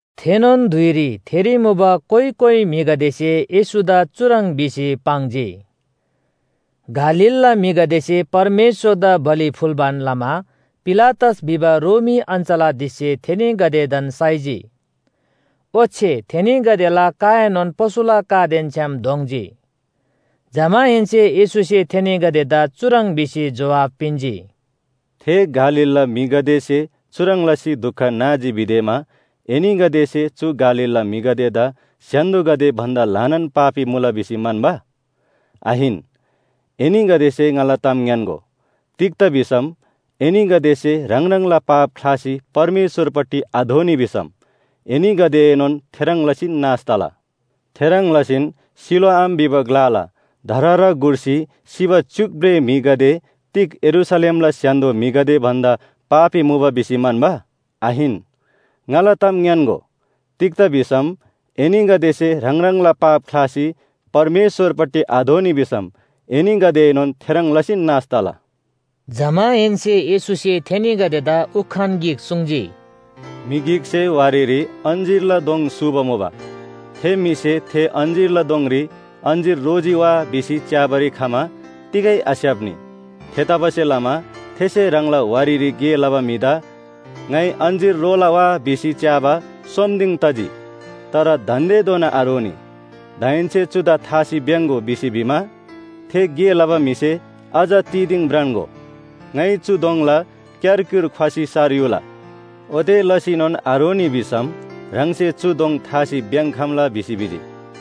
थेनोन धुइरी थेरी मुबा कोइ कोइ म्‍हिगदेसे येशूदा चुह्रङ् भिसी पाङ्जी। गालीलला म्‍हिगदेसे परमेश्‍वरदा बलि फुल्‍बान लमा पिलातस भिबा रोमी अञ्‍चलाधीशसे थेनीगदेदान साइजी। ओच्‍छे थेनीगदेला काएनोन पशुला कादेन छ्‌याम दोङ्जी। जमाहेन्‍से येशूसे थेनीगदेदा चुह्रङ् भिसी जोहाब पिन्‍जी, “थे गालीलला म्‍हिगदेसे चुह्रङ् लसी दुख नाजी भिदेमा एनीगदेसे चु गालीलला म्‍हिगदेदा स्‍य्‍हान्‍दोगदे भन्‍दा ल्‍हानान पापी मुला भिसी म्‍हन्‍बा? आहिन, एनीगदेसे ङाला ताम ङ्‌यान्‍गो, तिग्‍दा भिसम एनीगदेसे ह्राङ ह्राङला पाप ख्‍लासी परमेश्‍वरपट्टि आदोःनी भिसम एनीगदेएनोन थेह्रङ् लसीन नाश तला। थेह्रङ् लसीन सिलोआम भिबा ग्‍लाला धरहरा गुर्सी सिबा च्‍युक भ्रेः म्‍हिगदे तिग यरूशलेमला स्‍य्‍हान्‍दो म्‍हिगदे भन्‍दा पापी मुबा भिसी म्‍हन्‍बा? आहिन, ङाला ताम ङ्‌यान्‍गो, तिग्‍दा भिसम एनीगदेसे ह्राङ ह्राङला पाप ख्‍लासी परमेश्‍वरपट्टि आदोःनी भिसम एनीगदेएनोन थेह्रङ् लसीन नाश तला।” जमाहेन्‍से येशूसे थेनीगदेदा उखान गिक सुङ्जी, “म्‍हि गिकसे वारीरी अञ्‍जीरला दोङ सूबा मुबा। थे म्‍हिसे थे अञ्‍जीरला दोङरी अञ्‍जीर रोजी वा भिसी च्‍याबारी खमा तिगै आस्‍याप्‍नी। थेतबासेलमा थेसे ह्राङला वारीरी गे लबा म्‍हिदा ‘ङाइ अञ्‍जीर रोला वा भिसी च्‍याबा सोम दिङ तजी, तर दान्‍देधोना आरोनी। दाहेन्‍से चुदा थासी भ्‍याङ्‍गो’ भिसी भिमा, थे गे लबा म्‍हिसे ‘अझ तिदिङ भ्रान्‍गो, ङाइ चु दोङला क्‍यारक्‍युर ख्‍वसी सार युला। ओते लसीनोन आरोनी भिसम ह्राङसे चु दोङ थासी भ्‍याङ्‍खम्‍ला’ भिसी भिजी।”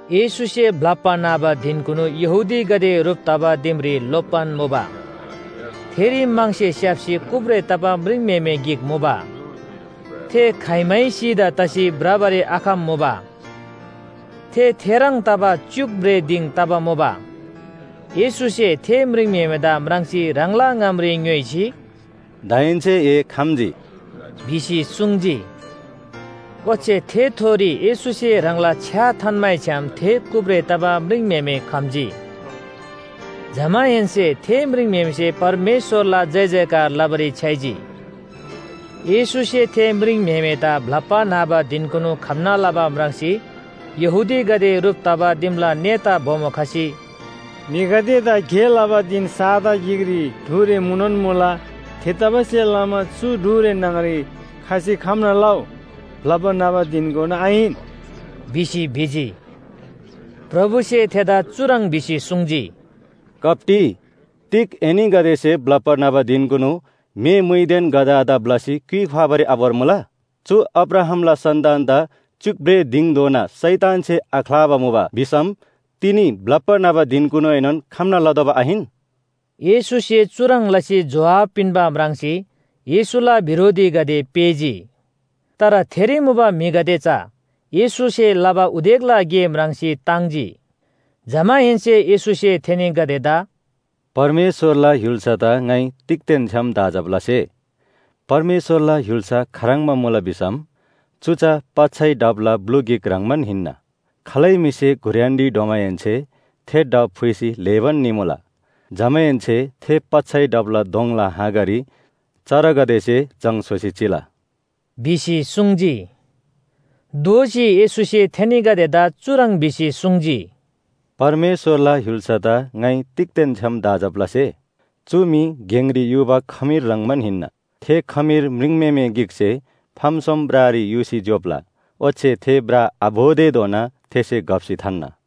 येशूसे ब्‍लप्‍बा न्‍हबा धिनकुनु यहूदीगदे ह्रुप तबा दिमरी लोप्‍बान मुबा। थेरी म्‍हङसे स्‍याप्‍सी कुब्रे तबा म्रिङम्‍हेमे गिक मुबा। थे खाइमै सिधा तसी भ्रबारी आखम्‍मुबा। थे थेह्रङ् तबा च्‍युक भ्रेः दिङ तबा मुबा। येशूसे थे म्रिङम्‍हेमेदा म्राङ्सी ह्राङला ङामरी ङ्‌योइसी, “दाहेन्‍से ए खम्‍जी” भिसी सुङ्जी। ओच्‍छे थेथोरी येशूसे ह्राङला छ्‌या थान्‍मैछ्‌याम थे कुब्रे तबा म्रिङम्‍हेमे खम्‍जी। जमाहेन्‍से थे म्रिङम्‍हेमेसे परमेश्‍वरला जयजयकार लबारी छ्‌याइजी। येशूसे थे म्रिङम्‍हेमेदा ब्‍लप्‍बा न्‍हबा धिनकुनु खम्‍ना लबा म्राङ्सी यहूदीगदे ह्रुप तबा दिमला नेता बोमो खसी, “म्‍हिगदेदा गे लबा धिन साता गिकरी ढुरे मुनोन मुला। थेतबासेलमा चु ढुरे न्‍हङरी खसी खम्‍ना लउ, ब्‍लप्‍बा न्‍हबा धिनकुनु आहिन” भिसी भिजी। प्रभुसे थेदा चुह्रङ् भिसी सुङ्जी, “कप्‍टी, तिग एनीगदेसे ब्‍लप्‍बा न्‍हबा धिनकुनु म्‍हे मुइदेन गधादा पुइसी क्‍युइ ख्‍वाबारी आभोर्मुला? चु अब्राहामला सन्‍तानदा च्‍युक भ्रेः दिङधोना शैतानसे आख्‍लाबा मुबा भिसम, तिनी ब्‍लप्‍बा न्‍हबा धिनकुनुएनोन खम्‍ना लतोःबा आहिन?” येशूसे चुह्रङ् लसी जोहाब पिन्‍बा म्राङ्सी, येशूला बिरोधीगदे पेःजी। तर थेरी मुबा म्‍हिगदे चा येशूसे लबा उदेकला गे म्राङ्सी ताङ्जी। जमाहेन्‍से येशूसे थेनीगदेदा “परमेश्‍वरला य्‍हुल्‍सादा ङाइ तिगदेन छ्‌याम दाँजब लसे? परमेश्‍वरला य्‍हुल्‍सा खाह्रङ्बा मुला भिसम, चु चा पच्‍छै ढापला ब्‍लु गिक ह्रङ्‌बान हिन्‍ना। खालै म्‍हिसे घुर्‍यानरी ढ्वमाहेन्‍से थे ढाप फुइसी ल्‍हेबान निमुला। जमाहेन्‍से थे पच्‍छै ढापला दोङला हाँगारी चरागदेसे जङ स्‍होसी चिला” भिसी सुङ्जी। दोःसी येशूसे थेनीगदेदा चुह्रङ् भिसी सुङ्जी, “परमेश्‍वरला य्‍हुल्‍सादा ङाइ तिगदेन छ्‌याम दाँजब लसे? चु मी गेङरी युबा खमीर ह्रङ्‌बान हिन्‍ना। थे खमीर म्रिङम्‍हेमे गिकसे फाम सोम ब्रारी युसी ज्‍योप्‍ला। ओच्‍छे थे ब्रा आभोतेधोना थेसे घप्‍सी थान्‍ना।”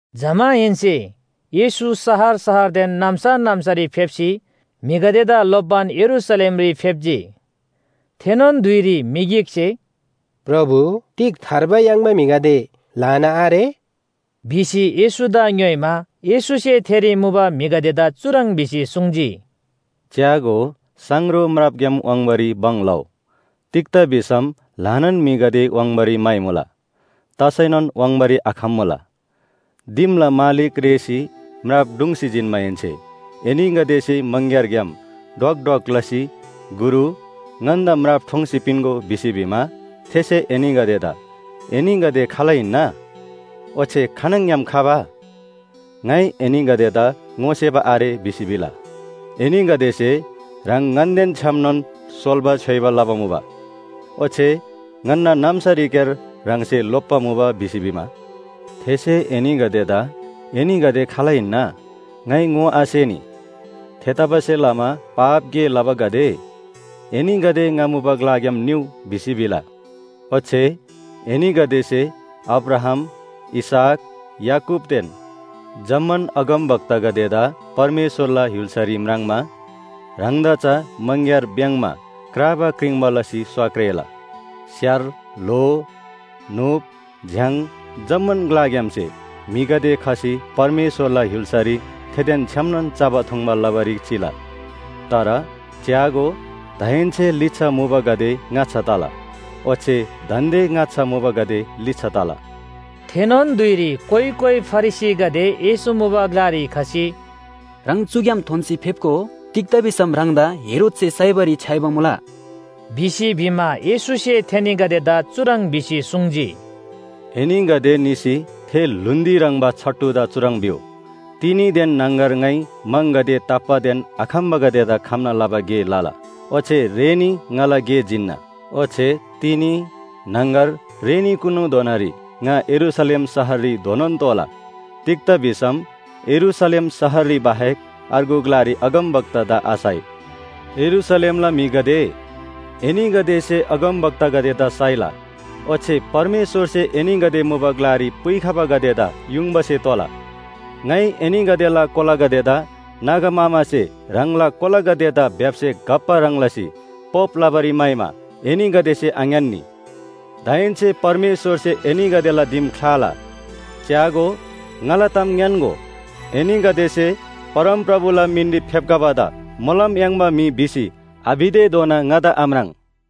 जमाहेन्‍से येशू शहर शहरदेन नाम्‍सा नाम्‍सारी फेप्‍सी म्‍हिगदेदा लोप्‍बान यरूशलेमरी फेप्‍जी। थेनोन धुइरी म्‍हि गिकसे, “प्रभु, तिग थार्बा याङ्बा म्‍हिगदे ल्‍हाना आरे?” भिसी येशूदा ङ्‌योइमा, येशूसे थेरी मुबा म्‍हिगदेदा चुह्रङ् भिसी सुङ्जी, “च्‍यागो, साङरो म्रापग्‍याम वाङ्बारी भङ लउ। तिग्‍दा भिसम ल्‍हानान म्‍हिगदे वाङ्बारी म्‍हाइमुला, तसैनोन वाङ्बारी आखम्‍मुला। दिमला मालिक रेःसी म्राप ढुङ्सी जिन्‍माहेन्‍से एनीगदेसे मङग्‍यारग्‍याम ढ्वक ढ्वक लसी ‘गुरु, ङन्‍दा म्राप ठोङ्सी पिन्‍गो’ भिसी भिमा, थेसे एनीगदेदा ‘एनीगदे खाल हिन्‍ना? ओच्‍छे खानङग्‍याम खबा? ङाइ एनीगदेदा ङोसेबा आरे’ भिसी भिला। एनीगदेसे ‘ह्राङ ङन्‍देन छ्‌यामनोन सोल्‍बा छ्‌योइबा लबा मुबा। ओच्‍छे ङन्‍ना नाम्‍सारीक्‍यार ह्राङसे लोप्‍बा मुबा’ भिसी भिमा, थेसे एनीगदेदा ‘एनीगदे खाल हिन्‍ना? ङाइ ङोआसेनी। थेतबासेलमा पाप गे लबागदे, एनीगदे ङा मुबा ग्‍लाग्‍याम निउ’ भिसी भिला। ओच्‍छे एनीगदेसे अब्राहाम, इसहाक, याकूबदेन जम्‍मान अगमवक्तागदेदा परमेश्‍वरला य्‍हुल्‍सारी म्राङ्मा, ह्राङदा चा मङग्‍यार भ्‍याङ्‍मा क्राबा क्रिङ्बा लसी स्‍वा क्रेला। स्‍यार, ल्‍हो, न्‍हुप, झ्‍याङ जम्‍मान ग्‍लाग्‍यामसे म्‍हिगदे खसी परमेश्‍वरला य्‍हुल्‍सारी थेदेन छ्‌यामनोन चबा थुङ्बा लबारी चिला। तर च्‍यागो, दान्‍दे लिच्‍छा मुबागदे ङाच्‍छा तला, ओच्‍छे दान्‍दे ङाच्‍छा मुबागदे लिच्‍छा तला।” थेनोन धुइरी कोइ कोइ फरिसीगदे येशू मुबा ग्‍लारी खसी, “ह्राङ चुग्‍याम थोन्‍सी फेप्‍गो। तिग्‍दा भिसम ह्राङदा हेरोदसे साइबारी छ्‌याइबा मुला” भिसी भिमा, येशूसे थेनीगदेदा चुह्रङ् भिसी सुङ्जी, “एनीगदे निसी थे ल्‍हुन्‍दी ह्रङ्‌बा छट्टुदा चुह्रङ् भिउ, ‘तिनीदेन न्‍हङगर ङाइ म्‍हङगदे ताप्‍बादेन आखम्‍बागदेदा खम्‍ना लबा गे लला, ओच्‍छे रेनी ङाला गे जिन्‍ना।’ ओच्‍छे तिनी, न्‍हङगर, रेनीकुनुधोनारी ङा यरूशलेम शहररी धोनोन तोःला। तिग्‍दा भिसम यरूशलेम शहररी बाहेक अर्गु ग्‍लारी अगमवक्तादा आसाइ! “यरूशलेमला म्‍हिगदे, एनीगदेसे अगमवक्तागदेदा साइला ओच्‍छे परमेश्‍वरसे एनीगदे मुबा ग्‍लारी पुइखबागदेदा युङबासे तोला। ङाइ एनीगदेला कोलागदेदा नागा मामासे ह्राङला कोलागदेदा भ्‍याप्‍से घप्‍बा ह्रङ् लसी पोप लबारी म्‍हाइमा एनीगदेसे आङ्‌यान्‍नी। दाहेन्‍से परमेश्‍वरसे एनीगदेला दिम ख्‍लाला। च्‍यागो, ङाला ताम ङ्‌यान्‍गो, एनीगदेसे ‘परमप्रभुला मिनरी फेप्‍खबादा मोलम याङ्बा म्‍हि’ भिसी आभितेधोना ङादा आम्राङ्।”